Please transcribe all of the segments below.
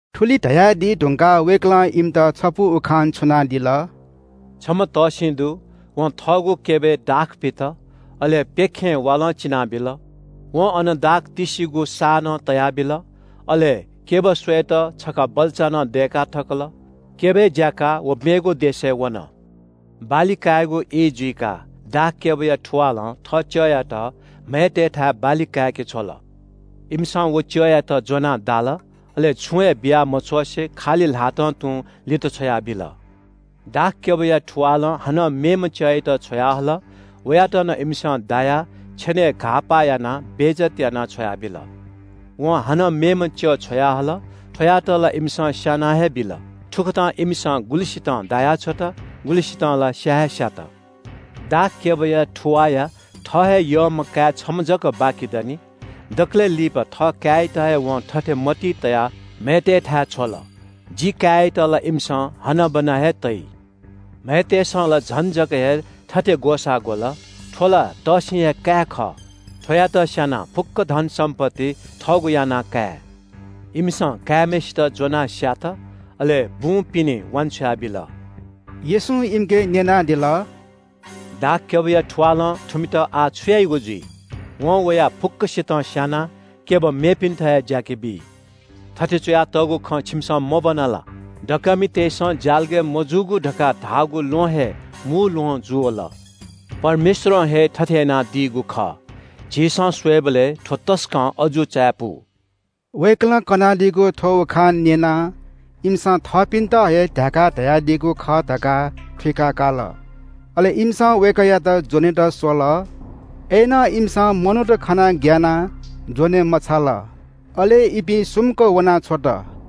थुलि धयादी धुंकाः वय्‌कलं इमित छपु उखान छुनादिल। “छम्‍ह तःसिं दु। वं थःगु क्‍यबय् दाख पित। अले प्‍यखें वालं चिनाबिल। वं अन दाख तिस्‍सिगु साः नं तयाबिल। अले क्‍यब स्‍वयेत छखा बल्‍चा नं दय्‌का थकल। क्‍यबय् ज्‍याकाः व मेगु देशय् वन। बाली कायेगु ई जुइकाः दाखक्‍यबया थुवालं थः च्‍यःयात म्‍हय्‌तय्‌थाय् बाली काय्‌के छ्वल। इमिसं व च्‍यःयात ज्‍वनाः दाल, अले छुं हे बिया मछ्वसें खालि ल्‍हातं तुं लित छ्वयाबिल। दाखक्‍यबया थुवालं हानं मेम्‍ह च्‍यःयात छ्वयाहल। वयात नं इमिसं दायाः छेनय् घाःपाः यानाः बेइज्‍जत यानाः छ्वयाबिल। वं हानं मेम्‍ह च्‍यः छ्वयाहल, थ्‍वयात ला इमिसं स्‍याना हे बिल। थुकथं इमिसं गुलिसितं दायाछ्वत, गुलिसितं ला स्‍या हेस्‍यात। दाखक्‍यबया थुवाःया थः हे यःम्‍ह काय् छम्‍ह जक बाकि दनि। दकलय् लिपा थःकाय्‌यात हे वं थथे मतिइ तयाः म्‍हय्‌तय्‌थाय् छ्वल – ‘जि काय्‌यात ला इमिसं हनाबना हे तइ।’ “म्‍हय्‌तय्‌सं ला झन जक हे थथे ग्‍वसाः ग्‍वल – ‘थ्‍व ला तःसिंया हे काय् खः, थ्‍वयात स्‍यानाः फुक्‍क धनसम्‍पत्ति थःगु याना काये।’ इमिसं काय्‌म्‍हय्‌सित ज्‍वनाः स्‍यात, अले बुं पिने वान्‍छ्वया बिल।” येशूं इमिके न्‍यनादिल – “दाखक्‍यबया थुवालं थुमित आः छु याइगु जुइ? वं वयाः फुक्‍कसितं स्‍यानाः क्‍यब मेपिन्‍त हे ज्‍याके बी। थथे च्‍वयातःगु खँ छिमिसं मब्‍वना ला? “‘दकःमितय्‌सं ज्‍यालगय् मजूगु धकाः धाःगु ल्‍वहं हे मू ल्‍वहं जूवल। परमेश्‍वरं हे थथे यानादीगु खः। झीसं स्‍वयेबलय् थ्‍व तसकं अजू चायापु!’” वय्‌कलं कनादीगु थ्‍व उखान न्‍यनाः इमिसं थःपिन्‍त हे ध्‍याकाः धयादीगु खः धकाः थुइका काल। अले इमिसं वय्‌कःयात ज्‍वनेत स्‍वल। अय्‌नं इमिसं मनूत खनाः ग्‍यानाः ज्‍वने मछाल, अले इपिं सुम्‍क वनाछ्वत।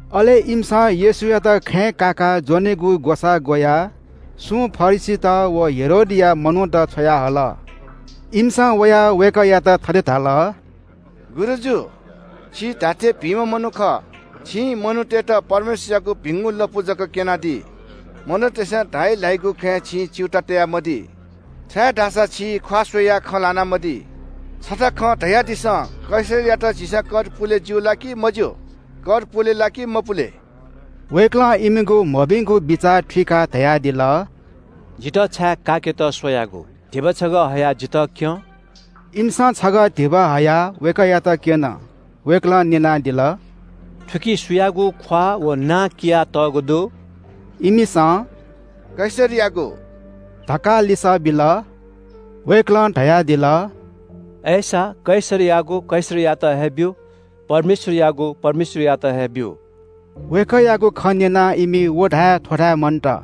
अले इमिसं येशूयात खँय् काकाः ज्‍वनेगु ग्‍वसाः ग्‍वयाः सुं फरिसीत व हेरोदया मनूत छ्वयाहल। इमिसं वयाः वय्‌कःयात थथे धाल – “गुरुजु, छि धात्‍थें भिंम्‍ह मनू खः। छिं मनूतय्‌त परमेश्‍वरयागु भिंगु लँपु जक क्‍यनादी। मनूतय्‌सं धाइ ल्‍हाइगु खँय् छिं च्‍यूताः तयामदी, छाय्‌धाःसा छिं ख्‍वाः स्‍वयाः खँ ल्‍हानामदी। छता खँ धयादिसँ, कैसरयात झीसं कर पुले ज्‍यू ला कि मज्‍यू? कर पुले ला कि मपुले?” वय्‌कलं इमिगु मभिंगु बिचाः थुइकाः धयादिल – “जितः छाय् काय्‌केत स्‍वयागु? धिबा छगः हयाः जितः क्‍यँ।” इमिसं छगः धिबा हयाः वय्‌कःयात क्‍यन। वय्‌कलं न्‍यनादिल – “थुकी सुयागु ख्‍वाः व नां कियातःगु दु?” इमिसं “कैसरयागु” धकाः लिसः बिल। वय्‌कलं धयादिल – “अय्‌सा, कैसरयागु कैसरयात हे ब्‍यु, परमेश्‍वरयागु परमेश्‍वरयात हे ब्‍यु।” वय्‌कःयागु खँ न्‍यनाः इमि व धाये थ्‍व धाये मन्‍त।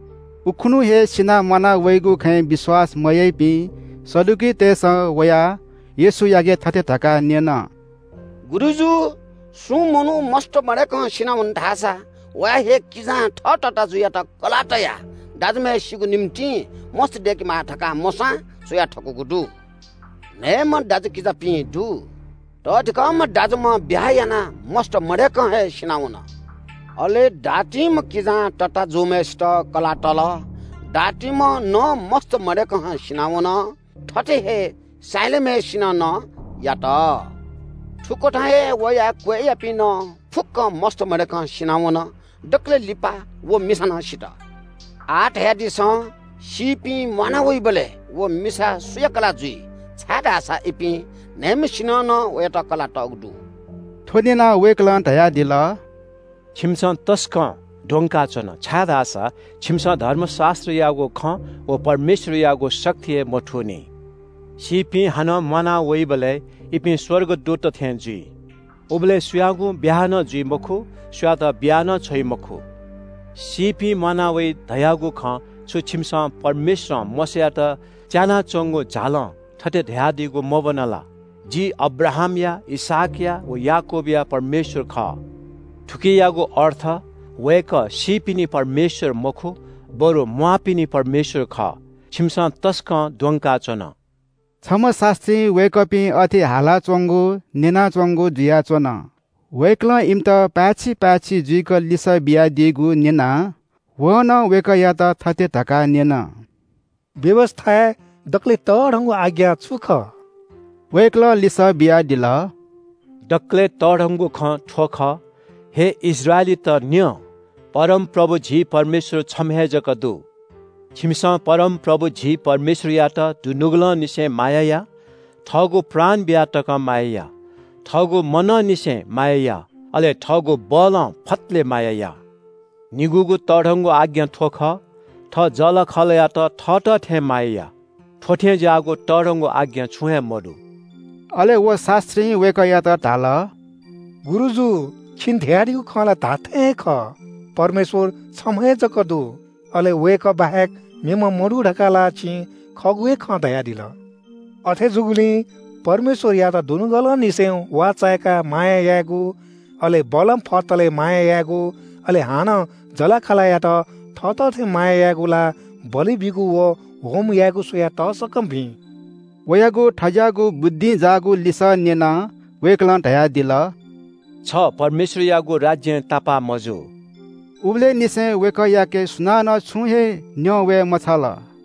उखुन्‍हु हे सिनाः म्‍वाना वइगु खँय् विश्‍वास मयाइपिं सदुकीतय्‌सं वयाः येशूयाके थथे धकाः न्‍यन – “गुरुजु, सुं मनू मस्‍त मदय्‌कं सिनावन धाःसा वया हे किजां थः तताःजुयात कलाः तयाः दाजुम्‍हय्‌सिगु निंतिं मस्‍त दय्‌केमाः धकाः मोशां च्‍वया थकूगु दु। न्‍हय्‌म्‍ह दाजुकिजापिं दु। तःधिकःम्‍ह दाजुम्‍ह ब्‍याहा यानाः मस्‍त मदय्‌कं हे सिनावन। अले दातिम्‍ह किजां तताःजुम्‍हय्‌सित कलाः तल। दातिम्‍ह नं मस्‍त मदय्‌कं हे सिनावन। थथे हे साहिलाम्‍हय्‌सिनं नं यात। थुकथं हे वयां क्‍वय्‌यापिं नं फुक्‍कं मस्‍त मदय्‌कं सिनावन। दकलय् लिपा व मिसा नं सित। आः धयादिसँ, सीपिं म्‍वाना वइबलय् व मिसा सुया कलाः जुइ, छाय्‌धाःसा इपिं न्‍हय्‌म्‍हय्‌सिनं नं वयात कलाः तःगु दु।” थ्‍व न्‍यनाः वय्‌कलं धयादिल – “छिमिसं तसकं द्वंकाच्‍वन, छाय्‌धाःसा छिमिसं धर्मशास्‍त्रयागु खँ व परमेश्‍वरयागु शक्ति हे मथूनि। सीपिं हानं म्‍वाना वइबलय् इपिं स्‍वर्गदूतत थें जुइ। उबलय् सुयागुं ब्‍याहा नं जुइ मखु, सुयातं बिया नं छ्वइ मखु। “सीपिं म्‍वाना वइ धयागु खँ छु छिमिसं परमेश्‍वरं मोशायात च्‍यानाच्‍वंगु झालं थथे धयादीगु मब्‍वना ला? – ‘जि अब्राहामया, इसहाकया व याकूबया परमेश्‍वर खः।’ थुकियागु अर्थ वय्‌कः सीपिनि परमेश्‍वर मखु, बरु म्‍वाःपिनि परमेश्‍वर खः। छिमिसं तसकं द्वंकाच्‍वन।” छम्‍ह शास्‍त्रीं वय्‌कःपिं अथे हालाच्‍वंगु न्‍यनाच्‍वंगु जुयाच्‍वन। वय्‌कलं इमित पाय्‌छि पाय्‌छि जुइक लिसः बियादीगु न्‍यनाः वं नं वय्‌कःयात थथे धकाः न्‍यन – “व्‍यवस्‍थाय् दकलय् तःधंगु आज्ञा छु खः?” वय्‌कलं लिसः बियादिल – “दकलय् तःधंगु खँ थ्‍व खः – ‘हे इस्राएलीत न्‍यँ! परमप्रभु झी परमेश्‍वर छम्‍ह हे जक दु। छिमिसं परमप्रभु झी परमेश्‍वरयात दुनुगलंनिसें माया या, थःगु प्राण बिया तकं माया या, थःगु मनंनिसें माया या, अले थःगु बलं फतले माया या।’ निगूगु तःधंगु आज्ञा थ्‍व खः – ‘थः जःलाखःलायात थःत थें माया या।’ थ्‍व थें ज्‍याःगु तःधंगु आज्ञा छुं हे मदु।” अले व शास्‍त्रीं वय्‌कःयात धाल – “गुरुजु, छिं धयादीगु खँ ला धात्‍थें हे खः। परमेश्‍वर छम्‍ह हे जक दु। अले वय्‌कः बाहेक मेम्‍ह मदु धकाः ला छिं खःगु हे खँ धयादिल। अथे जूगुलिं परमेश्‍वरयात दुनुगलंनिसें वाःचाय्‌काः माया यायेगु, अले बलं फतलय् माया यायेगु, अले हानं जःलाखःलायात थःत थें माया यायेगु ला बलि बीगु व होमबलि स्‍वयाः तसकं भिं।” वयागु थज्‍याःगु बुद्धिं जाःगु लिसः न्‍यनाः वय्‌कलं धयादिल – “छ परमेश्‍वरयागु राज्‍यं तापाः मजू।” उबलय्‌ निसें वय्‌कःयाके सुनानं छुं हे न्‍यं वये मछाल।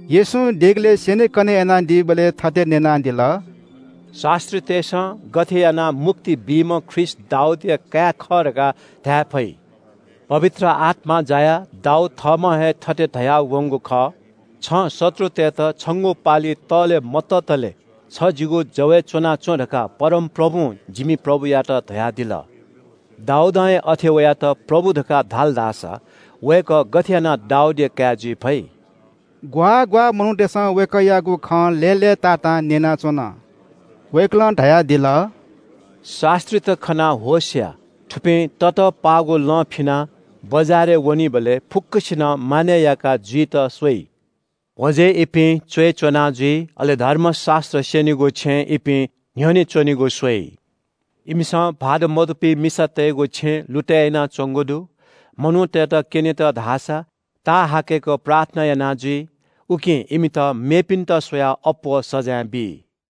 येशूं देगलय् स्‍यनेकने यानादीबलय् थथे न्‍यनादिल – “शास्‍त्रीतय्‌सं गथे यानाः मुक्ति बीम्‍ह ख्रीष्‍ट दाऊदया काय् खः धकाः धाये फइ? पवित्र आत्‍मां जायाः दाऊद थःम्‍हं हे थथे धयावंगु खः – “‘छं शत्रुतय्‌त छंगु पालि तःले मततले छ जिगु जवय् च्‍वनाच्‍वँ धकाः परमप्रभुं जिमि प्रभुयात धयादिल।’ “दाऊदं हे अथे वयात ‘प्रभु’ धकाः धाल धाःसा वय्‌कः गथे यानाः दाऊदया काय् जुइ फइ?” ग्‍वाः ग्‍वाः मनूतय्‌सं वय्‌कःयागु खँ लय्‌लय्‌तातां न्‍यनाच्‍वन। वय्‌कलं धयादिल – “शास्‍त्रीत खनाः होश या। थुपिं ततःपाःगु लं फिनाः बजारय् वनीबलय् फुक्‍कसिनं मानय् याका जुइत स्‍वइ। भ्‍वजय् इपिं च्‍वय् च्‍वना जुइ, अले धर्मशास्‍त्र स्‍यनीगु छेँय् इपिं न्‍ह्यःने च्‍वनेगु स्‍वइ। इमिसं भाःत मदुपिं मिसातय्‌गु छेँ लुतय् यानाच्‍वंगु दु। मनूतय्‌त क्‍यनेत धाःसा ताःहाकय्‌क प्रार्थना याना जुइ। उकिं इमित मेपिन्‍त स्‍वयाः अप्‍वः सजाँय बी।”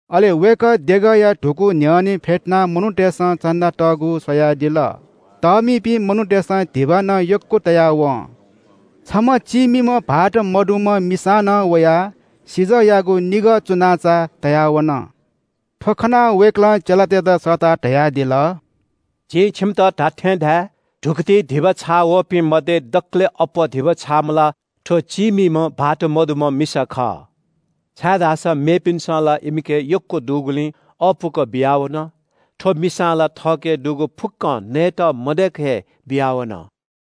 अले वय्‌कः देगःया धुकू न्‍ह्यःने फ्‍यतुनाः मनूतय्‌सं चन्‍दा तःगु स्‍वयादिल। तःमिपिं मनूतय्‌सं धिबा नं यक्‍व तया वं। छम्‍ह चीमिम्‍ह विधवा मिसां नं वयाः सिजःयागु निगः चुन्‍नाचा तया वन। थ्‍व खनाः वय्‌कलं चेलातय्‌त सःताः धयादिल – “जिं छिमित धात्‍थें धाये – धुकुतिइ धिबा छाःवःपिं मध्‍ये दकलय् अप्‍वः धिबा छाःम्‍ह ला थ्‍व चीमिम्‍ह विधवा मिसा खः। छाय्‌धाःसा मेपिन्‍सं ला इमिके यक्‍व दुगुलिं अःपुक बियावन। थ्‍व मिसां ला थःके दुगु फुक्‍कं नयेत मदय्‌क हे बियावन।”